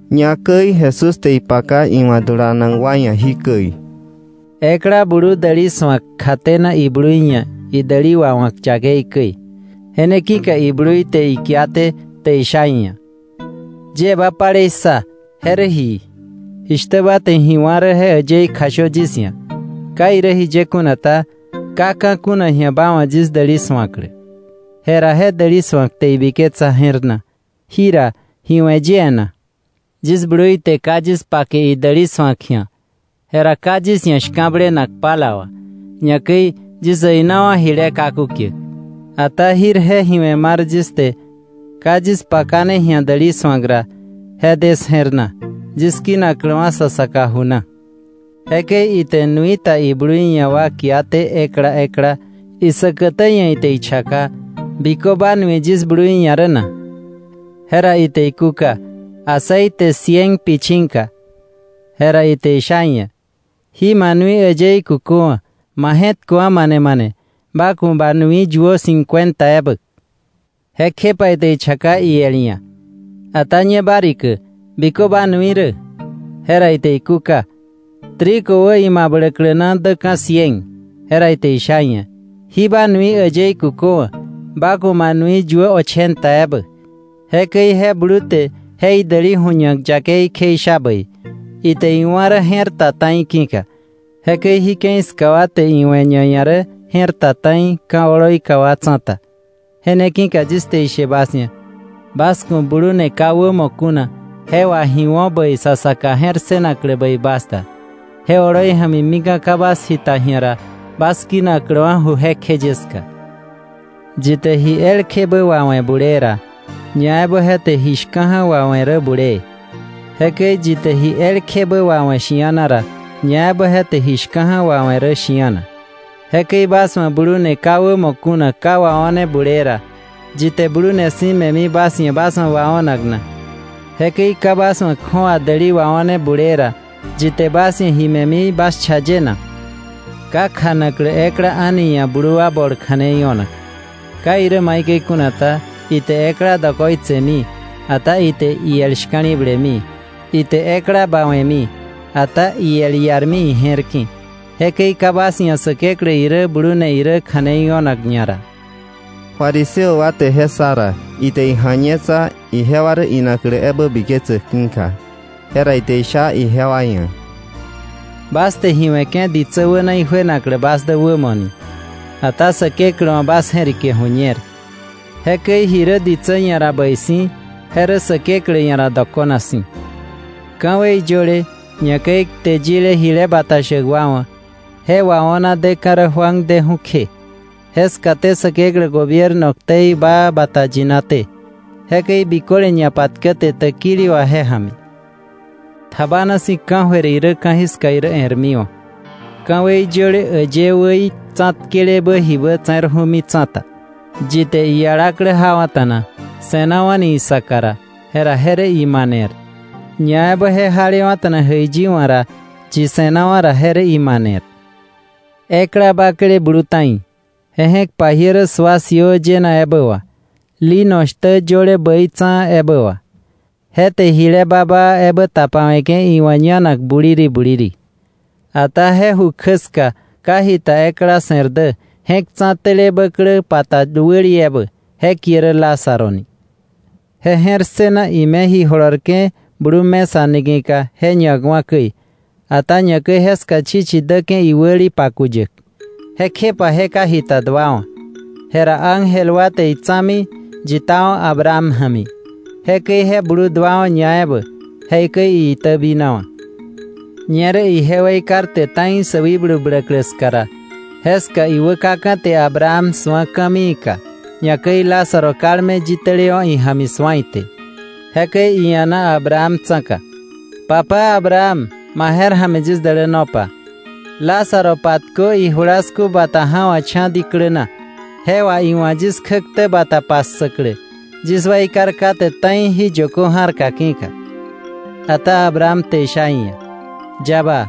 Ñakäi Jesús te ipaka iwa̱ dulanak wa ia̱ jikäi: “Ekla blu däli su̱ak kjatena iblui ia̱ idäli wawa̱k yakei käi. Je ne ki̱ka iblui te ikiaté te isha ia̱: ‘Yie ba palei ssa, ¿je rä ji? Jishtä ba te ji wá̱ rä je äyëí kjashö yis ia̱. Ka irä jiye kuna ta, ka ka̱ kuna ji̱a ba wa̱ yis däli su̱aklä.’ Jera je däli su̱ak te ibiketsa je̱r na: ‘Jira ¿ji we̱ yie na? Yis blui te ka yis pake idäli su̱ak ji̱a. Jera ka yis ia̱ shka̱blenak pala wà, ñakäi yis äinawa̱ jile kaku kiäk. Ata jirje ji we̱ mar yis te ka yis pakane ji̱a däli su̱ak ra, je de 'sje̱r na; yis kinakläwa̱ sa saka ju na.’ Jekäi ite nui ta iblui ia̱ wa kia te ekla ekla. Isäkätä ia̱ ite ichaka: ‘¿Bikö ba nui yis blui ia̱ rä na?’ Jera ite ikúka: ‘Aceite cien pichinga.’ Jera ite isha iia̱: ‘Jí ma nui äyëí kuköwa̱, ma je̱tköwa̱ mane mane, ba ku̱ ba nui yuö cincuenta ebä.’ Jekjepa ite ichaka iel ia̱: ‘Ata ñe ba rikä ¿bikö ma nui rä?’ Jera ite ikúka: ‘Trigo wä imabläklä na däka̱ cien. Jera ite isha iia̱: ‘Jí ma nui äyëí kuköwa̱, ba ku̱ ba nui yuö ochenta ebä.’ Jekäi je blu te je idäli ju̱ñak yakei kjeisha bäi, ite iwa̱ rä je̱r ta ta̱i ki̱ka. Jekäi jí ke̱i ska wa te iwe̱ ñaia̱ rä je̱r ta ta̱i ka̱ oloika wa tsa̱ta. “Je ne ki̱ka yis te ishe bas ia̱: Bas ku̱ blune ka wämo kuna je wà ji wo̱ bäi sa saka je̱r ssënaklä bäi bas da, je oloi ja̱mi mika̱ ka bas jita ji̱a ra, bas kinakläwa̱ ju jekjeye ska. “Yi te ji elkjebä wawe̱ bulee ra, ñaebä je te ji shka̱ja̱ wawe̱ rä bulee. Jekäi yi te ji elkjebä wawe̱ shi̱ana ra, ñaebä je te ji shka̱ja̱ wawe̱ rä shi̱ana. Jekäi bas wa̱ blune ka wämo kuna ka wao̱ne bulee ra, ¿yi te blune si̱ me̱mi bas ia̱ bas wa̱ wao̱nak na? Jekäi ka bas wa̱ kju̱awa däli wao̱ne bulee ra, ¿yi te bas ia̱ ji me̱mi bas cha ye na? “Ka kjanaklä ekla a̱ni ia̱ blu wa bol kja̱nei o̱nak. Ka irä maikäi kuna ta, ite ekla dokoitsemi, ata ite iel shka̱li̱blemi, ite ekla bawe̱mi, ata iel iarmi ije̱r ki̱. Jekäi ka bas ia̱ Säkeklä irä blune irä kja̱nei o̱nak ñara.” Fariseo wa te je ssa ra, ite ija̱ñetsa, ijewa rä inaklä ebä biketsäk ki̱ka. Jera ite isha ijewa ia̱: “Bas te ji we̱ke̱ ditsä wäna ijuenaklä bas dä wämo ni. Ata Säkeklä wa̱ bas je̱rike ju̱ñer. Jekäi ji rä ditsä ia̱ ra bäi si̱, je rä Säkeklä ia̱ ra dokona si̱. “Ka̱wei yöle, ñakäi kte yile jile bata shäk wa wa̱, je wao̱na deka̱ rä Juan deju̱ kje. Jeskaté Säkeklä gobierno ktei baa bata yinaté, jekäi biköle ñapatkäte täkili wà je ja̱mi. “Tjabana si̱ ka̱jöir irä ka̱jiska irä e̱rmiwa̱, ka̱wei yöle äyë wäí tsa̱tkelebä jibä wäte̱rju̱mi tsa̱ta. “Yi te ialaklä jawa̱ta̱na, se̱nawa̱ni isaka ra, jera je rä imaner. Ñaebä je jalewa̱ta̱na ijäiyi wa̱ ra yi se̱nawa̱ ra, jera je rä imaner. “Ekla bakle blu ta̱i, je je̱k pajiä rä sua siöö yëna ebä wà, lino shtä yöle bäitsa̱a̱ ebä wà. Je te jile baa baa ebä tapawe̱ke̱ iwa̱ ñanak buliri buliri. Ata je ju kjä ska ka jita ekla se̱r dä je̱k tsa̱tele bäklä pa ta wäli ebä, je kie rä Lázaro ni. Je je̱r ssëna ime ji jolorke̱ blu mesa niki̱ka je ñakwa̱ käi. Ata ñakäi jeska chichi däke̱ iwäli pakuyäk. Jekjepa je ka jita duawa̱. Jera ángel wa te itsa̱mi yitawa̱ Abraham ja̱mi. Jera je blu duawa̱ ñaebä, jekäi iitäbinawa̱. “Ñerä ije weikarte ta̱i sä wikblu bläklä ska ra, jeska iwä kaka̱ te Abraham su̱a ka̱mii ka, ñakäi Lázaro kalme yitälewa̱ ija̱mi su̱a ite. Jekäi ia̱na Abraham tsa̱ka: ‘¡Papá Abraham, ma je̱r ja̱mi yis dälänopa! Lázaro patkö ijulasku bata ja̱wa̱kcha̱ diklä na, je wà iwa̱ yis kjäktä bata patse̱wa̱klä, yis weikar kate ta̱i jí yökö ja̱rka ki̱ka.” Ata Abraham te isha iia̱: ‘Yaba,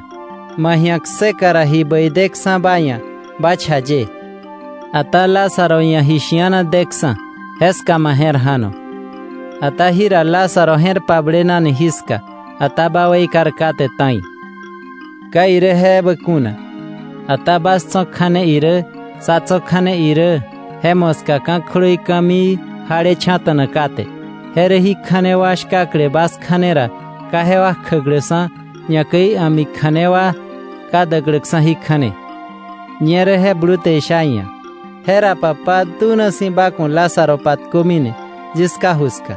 ma ji̱a kseka ra ji bäi deksa̱ ba ia̱ ba cha ye, ata Lázaro ia̱ ji shi̱ana deksa̱, jeska ma je̱r ja̱no. Ata jira Lázaro je̱r pablenani jiska, ata ba weikar kate ta̱i. Ka irä je ebä kuna. Ata bas tso̱ kja̱ne irä sá tso̱ kja̱ne irä, je moska ka̱ kjlöi ka̱mii jalecha̱ta̱na kate; je rä jí kja̱ne wa shkakle bas kja̱ne ra ka jewa kjäkläksa̱, ñakäi a̱mi kja̱ne wa ka däkläksa̱ jí kja̱ne.” “Ñerä je blu te isha iia̱: ‘Jera Papá, dunasi̱ ba ku̱ Lázaro patkömi yis ká ju ska,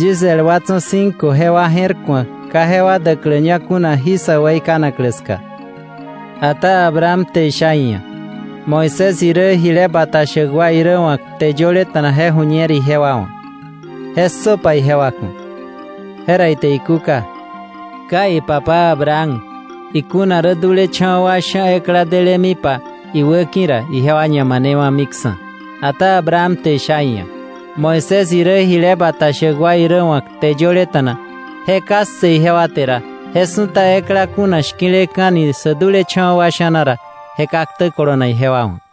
yis el wa tso̱ cinco jewa je̱r ku̱ak ka jewa däkläña kuna jí sä weikanaklä ska.’ Ata Abraham te isha iia̱: ‘Moisés irä jile bata shäk wa irä wa̱ kte yöleta̱na je ju̱ñer ijewa wa̱: ¡Je ssöpa ijewa ku̱!’ Jera ite ikúka: ‘Kai, Papá Abraham, ikuna rä dulecha̱wa̱ wa sha̱ ekla delemipa iwäki̱ ra, ijewa ñamanewa̱miksa̱.” Ata Abraham te isha iia̱: ‘Moisés irä jile bata shäk wa irä wa̱ kte yöleta̱na je ka ssë ijewa te ra, je su̱ta ekla kuna shki̱leka̱ni sä dulecha̱wa̱ wa sha̱na ra, je ka ktä kolonak ijewa wa̱.”